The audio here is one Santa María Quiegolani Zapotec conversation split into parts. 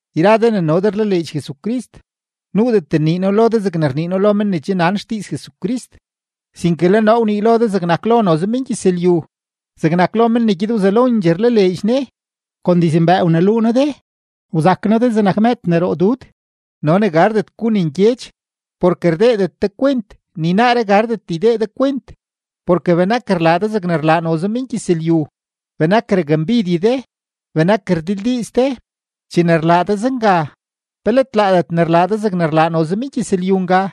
Yra de ne no de rlaleedx Jesucrist, nuudet nnii noo lo de zegne rnii noo lo men ne che nan xdiiz Jesucrist, sinke le noo wnii lo de zegnak lo noze mengyëzlyu, zegnak lo men ne gyed wzelondxee rlaleedx Ne. Kon dizmbëë wneluu noo de, wzak noo de zegnak mëëd ne roo dud no ne gardet gu ne ngyedx, porke rdeedet de kwent, ni naaree gardet ydee de kwent, porke benak rlaa de zegne rlaa noze mengyëzlyu, benak rakmbidye de, benak rdildiiz de. Chene rlaa de zenga, ¿pe let laadet ne rlaa de zegne rlaa noze mengyëzlyu nga?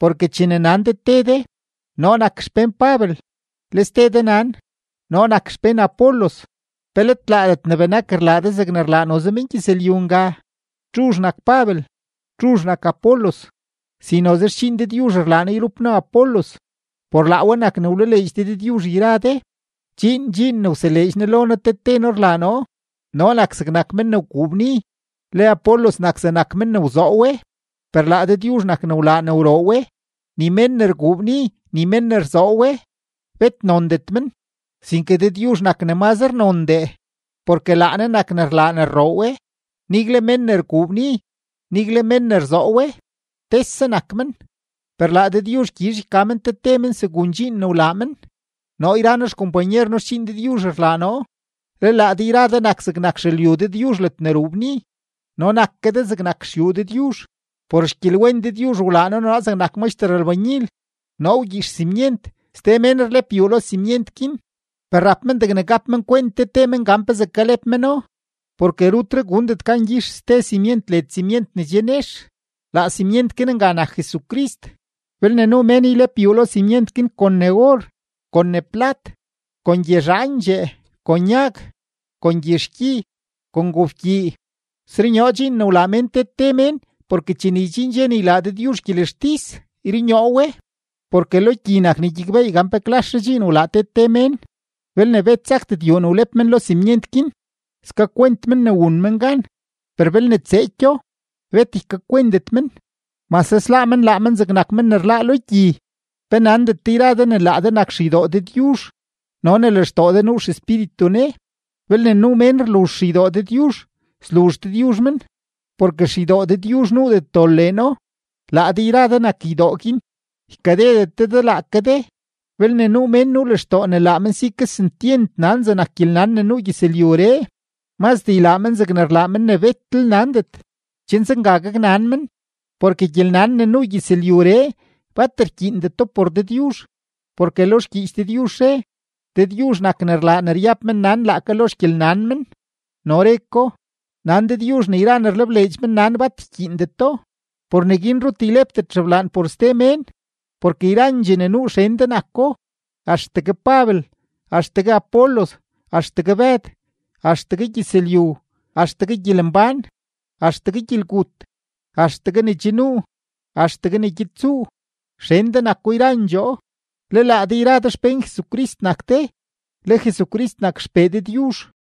Porke chene nan de te de: “Noo nak xpén Pabel”, le ste de nan: “Noo nak xpén Apolos”, ¿pe let laadet ne benak rlaa de zegne rlaa noze mengyëzlyu nga? ¿Txuzh nak Pabel? ¿Txuzh nak Apolos? Si noze xdxiin Dëdyuzh rlaa noo yrup noo Apolos, por laa we nak ne wlaleedx de Dëdyuzh yra de. Dxiin dxiin ne wseleedx Ne lo noo te te noo rlaa noo. Noo nak zegnak men ne wguu bni, le Apolos nak zegnak men ne wzoo we, per laa Dëdyuzh nak ne wlaa ne wroo we. Ni mén ne rguu bni, ni mén ne rzoo we, bet nondet men; sinke Dëdyuzh nak ne mazre nondee, porke laa Ne nak ne rlaa ne rroo we. Nigle mén ne rguu bni, nigle mén ne rzoo we, tese nak men, per laa Dëdyuzh gyizh yka men te te men segun dxiin ne wlaa men. Noo yra noo xkompanyer noo xdxiin Dëdyuzh rlaa noo, le laa de yra de nak zegnak xelyu Dëdyuzh ledne ruu bni. No nak ke de zegnak xyuu Dëdyuzh. Por xgyelwen Dëdyuzh wlaa Ne noo zegnak maxter lbanyil; noo wgyix simyent, ste mén rlep yuu lo simyent guin, per rap men degne gap men kwent te te men gan pezee kalep meno, porke rutre gundet gan gyix ste simyent led simyent ne che nex; laa simyent guin nga nak Jesucrist. Belne nuu mén ylep yuu lo simyent guin kon ne or, kon ne plat, kon gyezhaandxee, kon yag, kon gyizhkyi, kon gobkyii, srunyoo dxiin ne wlaa mén te te mén porke chene ydxiin dxe ne ylaa Dëdyuzh gyelextis, yrunyoo we, porke lo gyi nak ne gyakbeey gan pe klaszhe dxiin wlaa te te mén. Belne bet sakdet yuu ne wlep men lo simyent guin, skakwent men ne wun men gan, per belne tseekyo, bet ykakwentet men, mase sláá men laa men zegnak men ne rláá lo gyi. ¿Pe nandet de yra de ne laa de nak xeydoo Dëdyuzh no ne lextoo de nuu XEspíritu Ne? Belne nuu mén rluzh xeydoo Dëdyuzh, sluzh Dëdyuzh men, porke xeydoo Dëdyuzh nuudet dol leeno; laa de yra de nak ydoo guin. Ykadedet de de laake de. Belne nuu mén nuu lextoo ne laa men si kesentyent nan zegnak gyelnan ne nuu gyëzlyuree, mazdee ylaa men zegne rlaa men ne betlel nandet, chen zenga gaknan men. Porke gyelnan ne nuu gyëzlyuree, bat rkyiindeto por Dëdyuzh. Porke lo xgyiich Dëdyuzh re: “Dëdyuzh nak ne rlaa ne ryab mennan laake lo xgyelnan men.” No re ko: “Nan Dëdyuzh ne yra ne rlebleedx mennan bat ykyiindeto.” Por neguin rut ylepdet xeblaan por ste mén, porke yrandxee ne nuu xen de nako: axtegue Pabel, axtegue Apolos, axtegue Bëd, axtegue gyëzlyu, axtegue gyelembán, axtegue gyelgut, axtegue ne che nuu, axtegue ne gyed tsuu; xen de nako yrandxoo, le laa de yra de xpén Jesucrist nak de, le Jesucrist nak XPee Dëdyuzh.